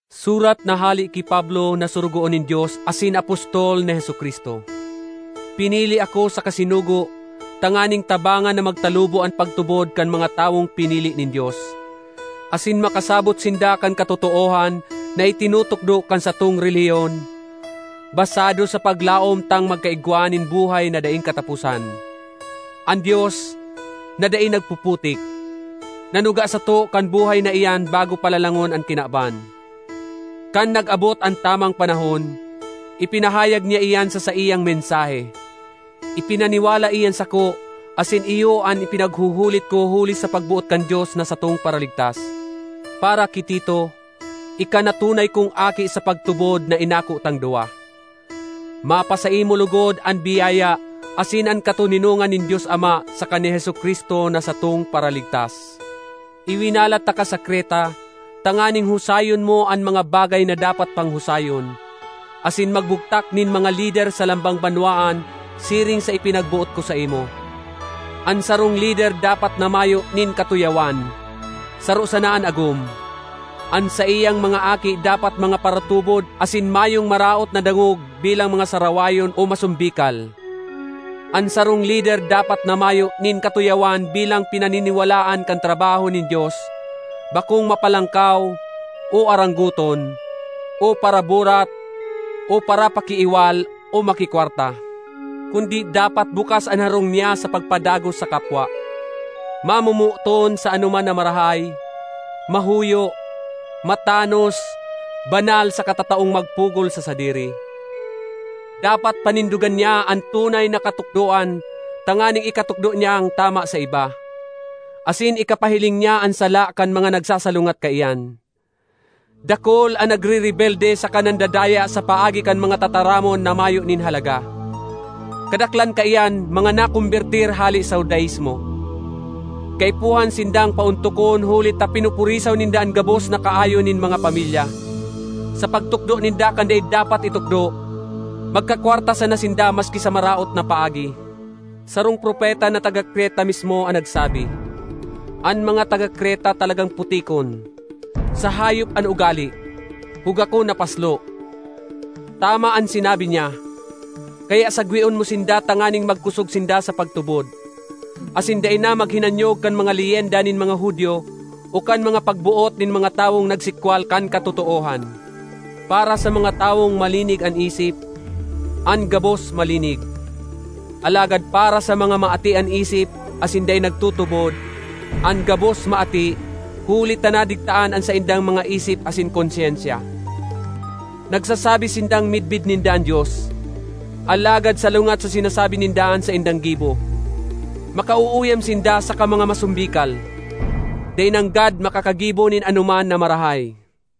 Surat na hale ki Pablo na sorogoon nin Dios asin apostol ni Jesu-Cristo. Pinili ako saka sinugo tanganing tabangan na magtalubo an pagtubod kan mga tawong pinili nin Dios, asin makasabot sinda kan katotoohan na itinutukdo kan satong relihiyon, basado sa paglaom tang magkaigwa nin buhay na daing kataposan. An Dios, na dai nagpuputik, nanuga sato kan buhay na iyan bago pa lalangon an kinaban. Kan nag-abot an tamang panahon, ipinahayag niya iyan sa saiyang mensahe. Ipinaniwala iyan sako asin iyo an ipinaghuhulit ko huli sa pagboot kan Dios na satong Paraligtas. Para ki Tito, ika na tunay kong aki sa pagtubod na inako tang duwa. Mapasaimo logod an biyaya asin an katoninongan nin Dios Ama saka ni Jesu-Cristo na satong Paraligtas. Iwinalat taka sa Creta tanganing husayon mo an mga bagay na dapat pang husayon, asin magbugtak nin mga lider sa lambang banwaan siring sa ipinagboot ko saimo. An sarong lider dapat na mayo nin katuyawan, saro sana an agom; an saiyang mga aki dapat mga paratubod asin mayong maraot na dangog bilang mga sarawayon o masombikal. An sarong lider dapat na mayo nin katuyawan bilang pinaniniwalaan kan trabaho nin Dios; bakong mapalangkaw, o aranggoton, o paraburat, o parapakiiwal, o makikwarta. Kundi dapat bukas an harong niya sa pagpadagos sa kapwa, mamomoton sa anoman na marahay, mahuyo, matanos, banal saka tataong magpugol sa sadiri. Dapat panindogan niya an tunay na katukdoan tanganing ikatukdo niyang tama sa iba, asin ikapahiling niya an sala kan mga nagsasalungat kaiyan. Dakul an nagrerebelde saka nandadaya sa paagi kan mga tataramon na mayo nin halaga; kadaklan kaiyan mga nakombertir hale sa Judaismo. Kaipuhan sindang paontokon huli ta pinupurisaw ninda an gabos na kaayon nin mga pamilya, sa pagtukdo ninda kan dai dapat itukdo, magkakwarta sana sinda maski sa maraot na paagi. Sarong propeta na taga Creta mismo an nagsabi, “An mga taga Creta talagang putikon, sa hayop an ugale, hugakon na paslo.” Tama an sinabi niya, kaya sagweon mo sinda tanganing magkosog sinda sa pagtubod, asin dai na maghinanyog kan mga leyenda nin mga Judio o kan mga pagboot nin mga tawong nagsikwal kan katotoohan. Para sa mga tawong malinig an isip, an gabos malinig; alagad para sa mga maati an isip asin dai nagtutubod, an gabos maati, huli ta nadigtaan an saindang mga isip asin konsyensya. Nagsasabi sindang midbid ninda an Dios, alagad salungat sa sinasabi ninda an saindang gibo. Makauuyam sinda saka mga masombikal; dai nanggad makakagibo nin anoman na marahay.